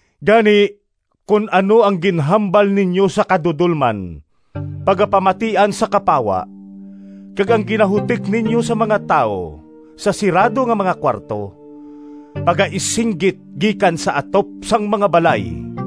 Gani, kon ano ang ginhambal ninyo sa kadudolman pagapamatian sa kapawa, kag ang ginahutik ninyo sa mga tawo sa sirado nga mga kuwarto pagaisinggit gikan sa atop sang mga balay.”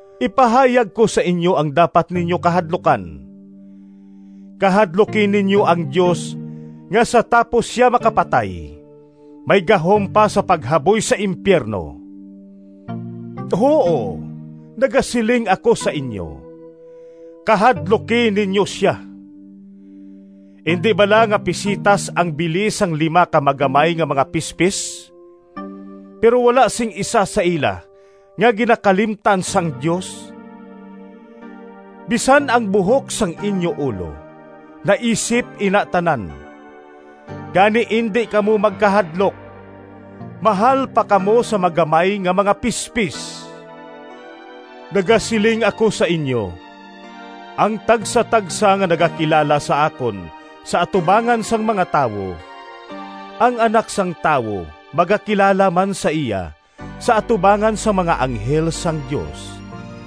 Ipahayag ko sa inyo ang dapat ninyo kahadlukan. Kahadluki ninyo ang Dios nga sa tapos sia makapatay, may gahom pa sa paghaboy sa impiyerno. Huo, nagasiling ako sa inyo, kahadluki ninyo sia! “Indi bala nga pisetas ang bili sang lima ka magamay nga mga pispis? Pero wala sing isa sa ila nga ginakalimtan sang Dios. Bisan ang buhok sang inyo ulo naisip ina tanan. Gani indi kamo magkahadlok! Mahal pa kamo sa magamay nga mga pispis!” “Nagasiling ako sa inyo, ang tagsatagsa nga nagakilala sa akon sa atubangan sang mga tawo, ang Anak sang Tawo magakilala man sa iya sa atubangan sang mga anghel sang Dios.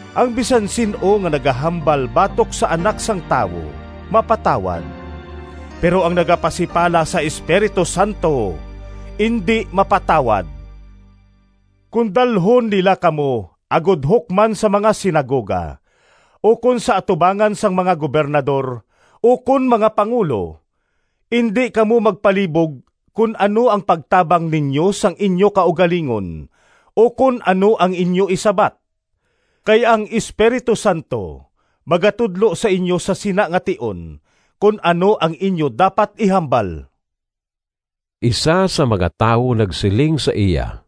“Ang bisan sin-o nga nagahambal batok sa Anak sang Tawo mapatawad, pero ang nagapasipala sa Espiritu Santo indi mapatawad. “Kon dalhon nila kamo agod hukman sa mga sinagoga ukon sa atubangan sang mga gobernador, ukon mga pangulo, indi kamo magpalibog kon ano ang pagtabang ninyo sang inyo kaugalingon ukon ano ang inyo isabat. Kay ang Espiritu Santo magatudlo sa inyo sa sina nga tion kon ano ang inyo dapat ihambal.” Isa sang mga tawo nagsiling sa iya,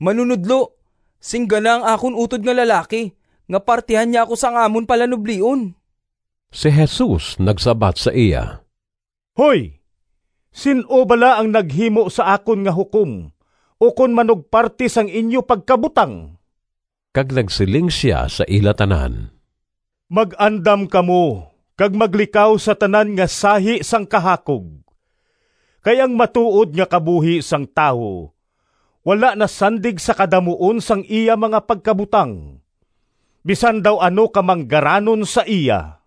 “Manunodlo, singgana ang akon utod nga lalaki nga partihan niya ako sang amon palanublion.” Si Jesus nagsabat sa iya, “Hoy, sin-o bala ang naghimo sa akon nga hukom ukon manugparti sang inyo pagkabutang?” Kag nagsiling sia sa ila tanan, “Mag-andam kamo kag maglikaw sa tanan nga sahi sang kahakog. Kay ang matuod nga kabuhi sang tawo wala nasandig sa kadamuon sang iya mga pagkabutang, bisan daw ano ka manggaranon sa iya.”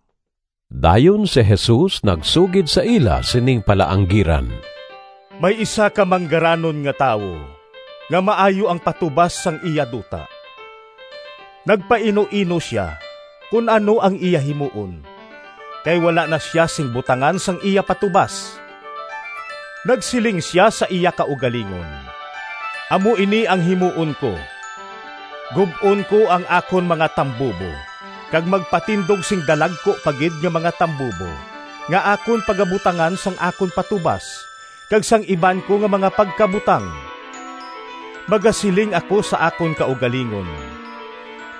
Dayon si Jesus nagsugid sa ila sining palaanggiran, “May isa ka manggaranon nga tawo nga maayo ang patubas sang iya duta. Nagpainuino sia kon ano ang iya himuon kay wala na sia sing butangan sang iya patubas. Nagsiling sia sa iya kaugalingon, ‘Amo ini ang himuon ko: Gub-on ko ang akon mga tambubo kag magpatindog sing dalagku pa gid nga mga tambubo nga akon pagabutangan sang akon patubas kag sang iban ko nga mga pagkabutang. Magasiling ako sa akon kaugalingon: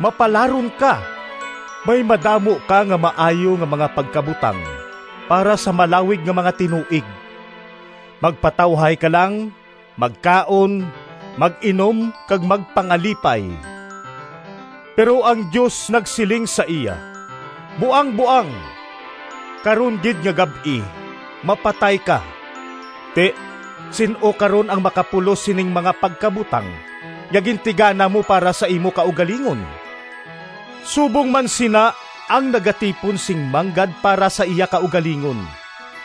Mapalaron ka! May madamo ka nga maayo nga mga pagkabutang para sa malawig nga mga tinuig. Magpatawhay ka lang, magkaon, mag-inom kag magpangalipay.’ Pero ang Dios nagsiling sa iya, ‘Buangboang! Karon gid nga gab-i mapatay ka. Ti sin-o karon ang makapulos sining mga pagkabutang nga gintigana mo para sa imo kaugalingon?’ “Subong man sina ang nagatipon sing manggad para sa iya kaugalingon,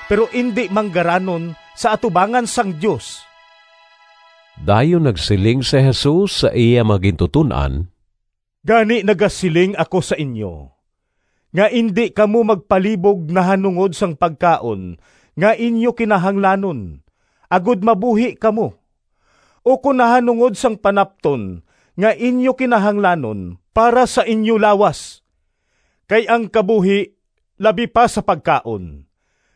pero indi manggaranon sa atubangan sang Dios.” Dayon nagsiling si Jesus sa iya mga gintuton-an, “Gani nagasiling ako sa inyo nga indi kamo magpalibog nahanungod sang pagkaon nga inyo kinahanglanon agod mabuhi kamo, ukon nahanungod sang panapton nga inyo kinahanglanon para sa inyo lawas. Kay ang kabuhi labi pa sa pagkaon,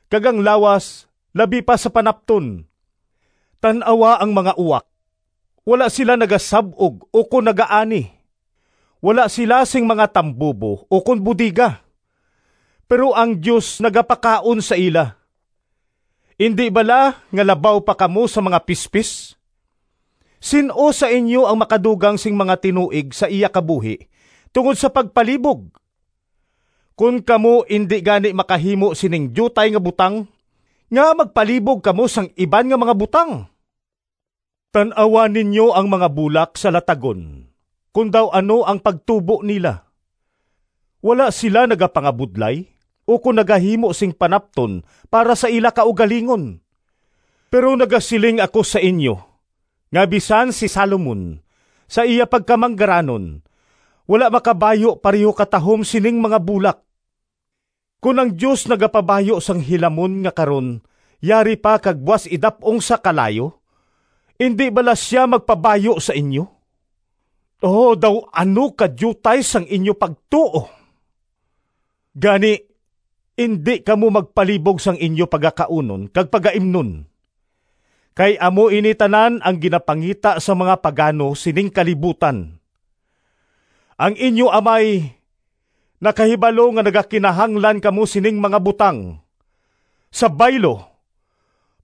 kag ang lawas labi pa sa panapton. Tan-awa ang mga uwak, wala sila nagasab-og ukon nagaani, wala sila sing mga tambubo ukon bodega, pero ang Dios nagapakaon sa ila. Indi bala nga labaw pa kamo sa mga pispis? Sin-o sa inyo ang makadugang sing mga tinuig sa iya kabuhi tungod sa pagpalibog? Kon kamo indi gani makahimo sining diutay nga butang, ngaa magpalibog kamo sang iban nga mga butang? Tan-awa ninyo ang mga bulak sa latagon kon daw ano ang pagtubo nila. Wala sila nagapangabudlay ukon nagahimo sing panapton para sa ila kaugalingon. Pero nagasiling ako sa inyo nga bisan si Salomon, sa iya pagkamanggaranon, wala makabayu pareho katahom sining mga bulak. Kon ang Dios nagapabayu sang hilamon nga karon yari pa kag buas idap-ong sa kalayo, indi bala sia magpabayu sa inyo? O daw ano kadiutay sang inyo pagtuo! Gani, indi kamo magpalibog sang inyo pagakaunon kag pagaimnon. (Kay amo ini tanan ang ginapangita sang mga pagano sining kalibutan.) Ang inyo Amay nakahibalo nga nagakinahanglan kamo sining mga butang. Sa baylo,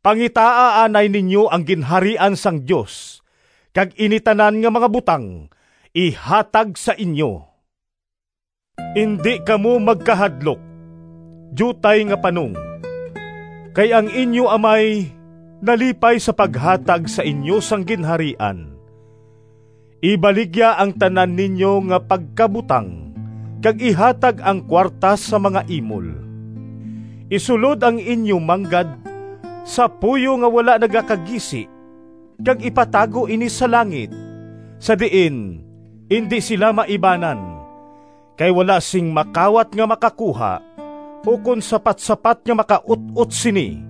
pangitaa anay ninyo ang Ginharian sang Dios kag ini tanan nga mga butang ihatag sa inyo.” “Indi kamo magkahadlok, diutay nga panong. Kay ang inyo Amay nalipay sa paghatag sa inyo sang Ginharian. Ibaligya ang tanan ninyo nga pagkabutang kag ihatag ang kuwarta sa mga imol. Isulod ang inyo manggad sa puyo nga wala nagakagisi kag ipatago ini sa langit, sa diin indi sila maibanan, kay wala sing makawat nga makakuha, ukon sapatsapat nga makaut-ot sini.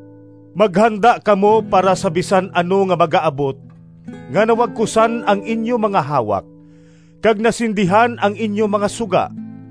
“Maghanda kamo para sa bisan ano nga magaabot, nga nawagkusan ang inyo mga hawak kag nasindihan ang inyo mga suga,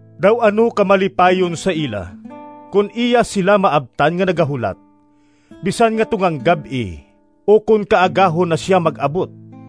Daw ano ka malipayon sa ila kon iya sila maabtan nga nagahulat, bisan nga tungang gab-i ukon kaagahon na sia mag-abot.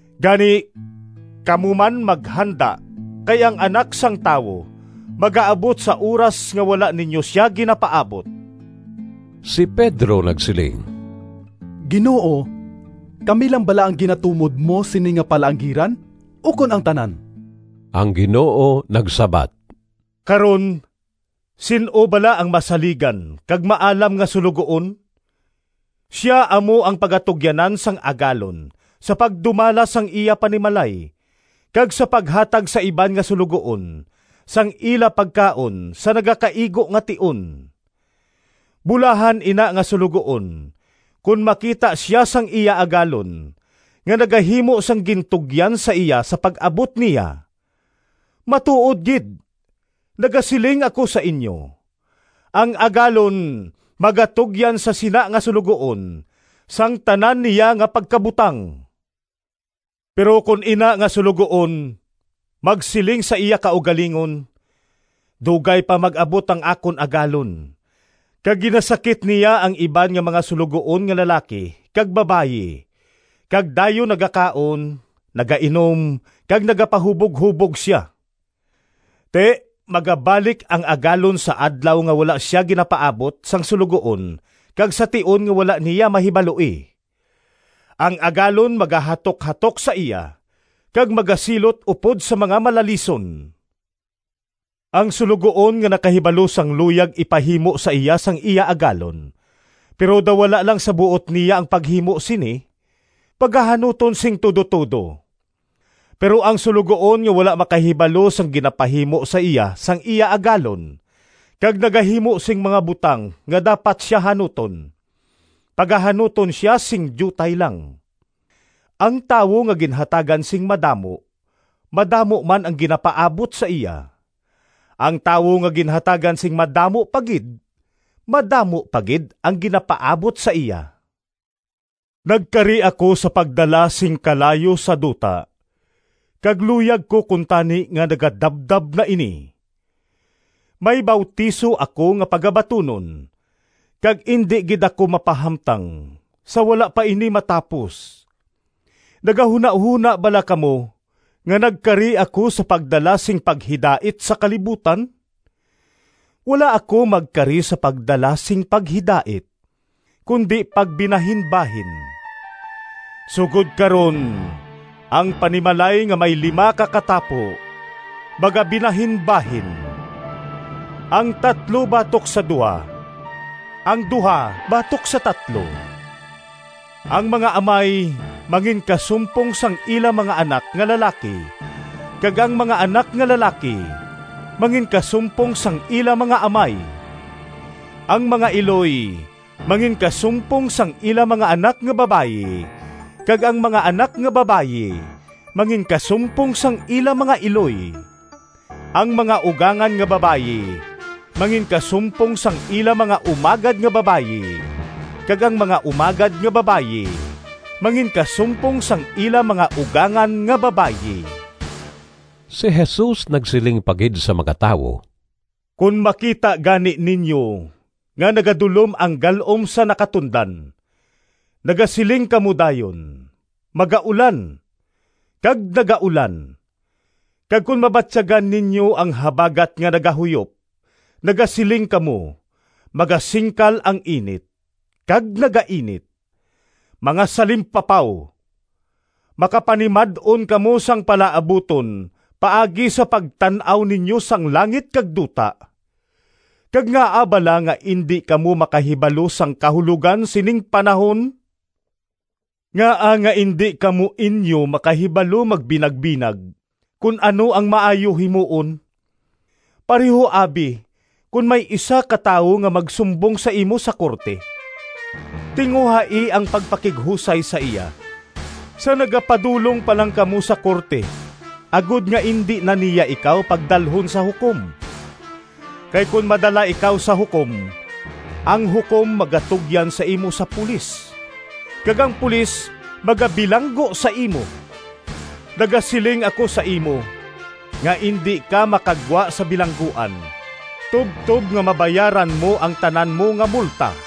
Gani, kamo man maghanda kay ang Anak sang Tawo magaabot sa oras nga wala ninyo sia ginapaabot.” Si Pedro nagsiling, “Ginoo, kami lang bala ang ginatumod mo sini nga palaanggiran ukon ang tanan?” Ang Ginoo nagsabat, “Karon sin-o bala ang masaligan kag maalam nga suloguon? Sia amo ang pagatugyanan sang agalon sa pagdumala sang iya panimalay kag sa paghatag sa iban nga suloguon sang ila pagkaon sa nagakaigo nga tion. Bulahan ina nga suloguon kon makita sia sang iya agalon nga nagahimo sang gintugyan sa iya sa pag-abot niya. Matuod gid, nagasiling ako sa inyo, ang agalon magatugyan sa sina nga suloguon sang tanan niya nga pagkabutang. Pero kon ina nga suloguon magsiling sa iya kaugalingon, ‘Dugay pa mag-abot ang akon agalon,’ kag ginasakit niya ang iban nga mga suloguon nga lalaki kag babayi, kag dayon nagakaon, nagainom kag nagapahuboghubog sia. Ti, magabalik ang agalon sa adlaw nga wala sia ginapaabot sang suloguon kag sa tion nga wala niya mahibaloi. Ang agalon magahatukhatok sa iya kag magasilot upod sa mga malalison. “Ang suloguon nga nakahibalo sang luyag ipahimo sa iya sang iya agalon, pero daw wala lang sa buot niya ang paghimo sini, pagahanuton sing tudo-tudo. Pero ang suloguon nga wala makahibalo sang ginapahimo sa iya sang iya agalon, kag nagahimo sing mga butang nga dapat sia hanuton, pagahanuton sia sing diutay lang. Ang tawo nga ginhatagan sing madamo, madamo man ang ginapaabot sa iya. Ang tawo nga ginhatagan sing madamo pa gid, madamo pa gid ang ginapaabot sa iya.” “Nagkari ako sa pagdala sing kalayo sa duta, kag luyag ko kuntani nga nagadabdab na ini! May bautiso ako nga pagabatunon, kag indi gid ako mapahamtang sa wala pa ini matapos! Nagahunahona bala kamo nga nagkari ako sa pagdala sing paghidait sa kalibutan? Wala ako magkari sa pagdala sing paghidait, kundi pagbinahinbahin. Sugod karon ang panimalay nga may lima ka katapo magabinahinbahin, ang tatlo batok sa duha, ang duha batok sa tatlo. Ang mga amay manginkasumpong sang ila mga anak nga lalaki kag ang mga anak nga lalaki manginkasumpong sang ila mga amay. Ang mga iloy manginkasumpong sang ila mga anak nga babayi, kag ang mga anak nga babayi manginkasumpong sang ila mga iloy. Ang mga ugangan nga babayi manginkasumpong sang ila mga umagad nga babayi kag ang mga umagad nga babayi manginkasumpong sang ila mga ugangan nga babayi.” Si Jesus nagsiling pa gid sa mga tawo, “Kon makita gani ninyo nga nagadulom ang gal-om sa nakatundan, nagasiling kamo dayon, ‘Magaulan,’ kag nagaulan. Kag kon mabatyagan ninyo ang habagat nga nagahuyop, nagasiling kamo, ‘Magasingkal ang init,’ kag nagainit. Mga salimpapaw! Makapanimad-on kamo sang palaabuton paagi sa pagtan-aw ninyo sang langit kag duta, kag ngaa bala nga indi kamo makahibalo sang kahulogan sining panahon?” “Ngaa nga indi kamo inyo makahibalo magbinagbinag kon ano ang maayo himuon? Pareho abi, kon may isa ka tawo nga magsumbong sa imo sa korte, tinguhai ang pagpakighusay sa iya sa nagapadulong pa lang kamo sa korte agod nga indi na niya ikaw pagdalhon sa hukom. Kay kon madala ikaw sa hukom, ang hukom magatugyan sa imo sa pulis, kag ang pulis magabilanggo sa imo. Nagasiling ako sa imo nga indi ka makagwa sa bilangguan tubtob nga mabayaran mo ang tanan mo nga multa.”